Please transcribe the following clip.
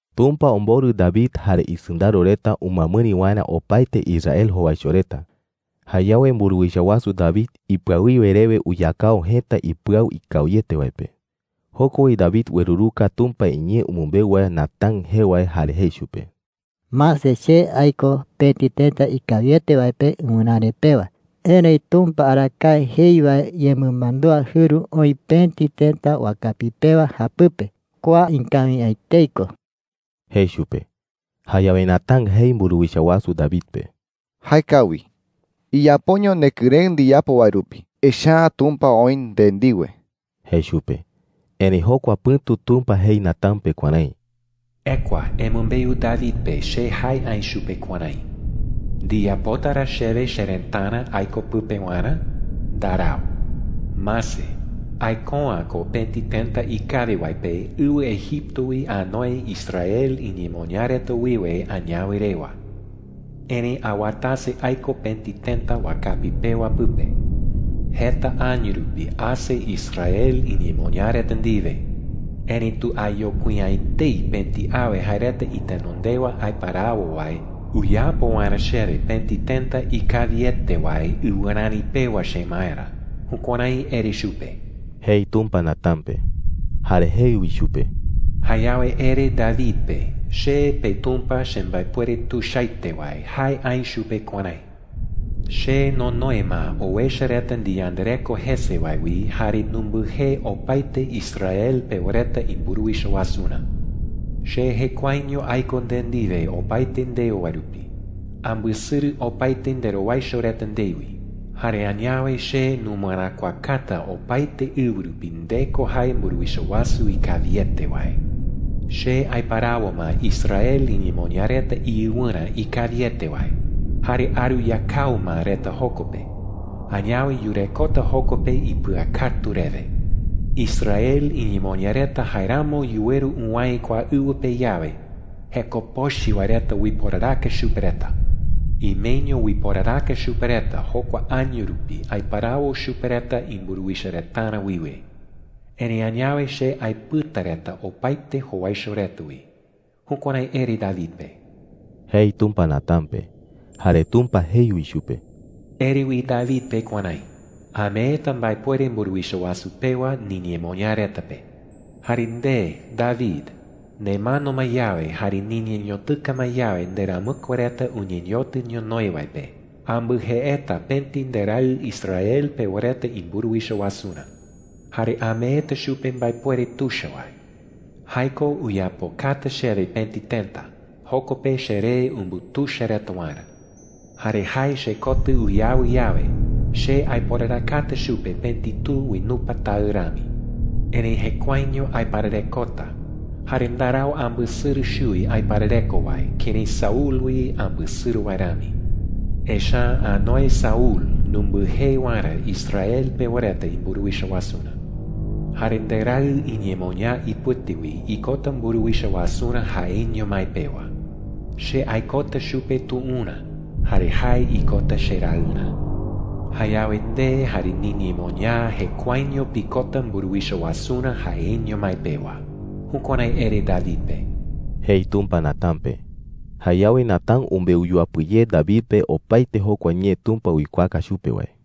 Tumpa omborɨ David jare isɨndaro reta umɨamɨri waerä opaete Israel jowaicho reta. Jayawe mburuwicha wasu David ipɨawiwe rewe uyakao jëta ipɨau ikawiete wae pe. Joko wi David ueruruka Tumpa iñee umɨmbeu wae Natán jee wae jare jei chupe: “Mase, che aiko pëti tëta ikawiete wae pe ɨwɨräre pewa. Erëi Tumpa arakae jei wae yemɨmandúa jɨru oï pëti tëta wakapi pewa japɨpe. Kua ikawi’ä etei ko,” jei chupe. Jayawe Natán jei mburuwicha wasu David pe: “Jaekawi,” jei chupe. “Iyapoño nekɨrëɨ ndiyapo wae rupi, echa’ä Tumpa oï nde ndiwe,” jei chupe. Erëi jokua pɨ̈tu Tumpa jei Natán pe kuärái: “Ekua embeu David pe che jae aï chupe kuärái: “¿Ndiyapota ra chewe cherëtarä aiko pɨpe waerä? ¡Ndarau! Mase, aiko’ä ko pëti tëta ikawi wae pe ɨwɨ Egipto wi anoe Israel iñemoñaa reta wiwe añawe rewa. Erëi awatase aiko pëti tëta wakapi pewa pɨpe. Jeta año rupi ase Israel iñemoñaa reta ndiwe. Erëitu ayokui’ä etei pëti awe jae reta itenondewa aiparawo wae uyapo waerä chewe pëti tëta ikawiete wae ɨwɨräre pewa chemaerä.’ Jukuärái ere chupe,” jei Tumpa Natán pe. Jare jei wi chupe: “Jayawe ere David pe che, peTumpa chembaepuere tuichaete wae, jae aï chupe kuärái: ‘Che nonoe ma owecha reta ndiyandareko jese wae wi jare numbɨjee opaete Israel pewa reta imburuwicha wasurä. Che jekuaeño aiko nde ndiwe opaete ndeo wae rupi. Ambɨsɨrɨ opaete nderowaicho reta ndewi. Jare añawe che numɨeräkuakata opaete ɨwɨ rupi nde ko jae mburuwicha wasu ikawiete wae. ‘Che aiparawo ma Israel iñemoñaa reta iɨwɨrä ikawiete wae jare aruyakao ma reta joko pe. Añawe yurekota joko pe ipɨakatu rewe. Israel iñemoñaa reta jaeramo yuweru uwäe kua ɨwɨ pe yawe, jeko pochɨ wae reta uiporaraka chupe reta. Imeño uiporaraka chupe reta jokua año rupi aiparawo chupe reta imburuwicha retarä wiwe. Erëi añawe che aepɨta reta opaete jowaicho reta wi.’ Jukuärái ere David pe,” jei Tumpa Natán pe. Jare Tumpa jei wi chupe: “Ere wi David pe kuärái: ‘Ameeta mbaepuere mburuwicha wasu pewa niñemoñaa reta pe. Jare nde, David, nemano ma yawe jare niñeñotɨka ma yawe nderamɨkue reta uñeñotɨ ñonoï wae pe, ambɨjeeta pëti nderaɨ Israel pewa reta imburuwicha wasurä. Jare ameeta chupe mbaepuere tuicha wae. Jae ko uyapokata chewe pëti tëta, joko pe cheree umbutuicha reta waerä. Jare jae chekotɨ uyawɨ yawe, che aiporarakata chupe pëti tu uinupa taɨ rami. Erëi jekuaeño aipararekota, jare ndarau ambɨsɨrɨ chuwi aiparareko wae kërái Saúl wi ambɨsɨrɨ wae rami. Echa’ä anoe Saúl numbɨjee waerä Israel pewa reta imburuwicha wasurä. Jare nderaɨ iñemoñaa ipɨte wi ikota mburuwicha wasurä jaeño mái pewa. Che aikota chupe tuurä jare jae ikota cheraɨrä. Jayawe nde jare niñemoñaa jekuaeño pikota mburuwicha wasurä jaeño mái pewa.’ Jukuärái ere David pe,” jei Tumpa Natán pe. Jayawe Natán umbeu yuapɨ ye David pe opaete jokua ñee Tumpa uikuaaka chupe wae.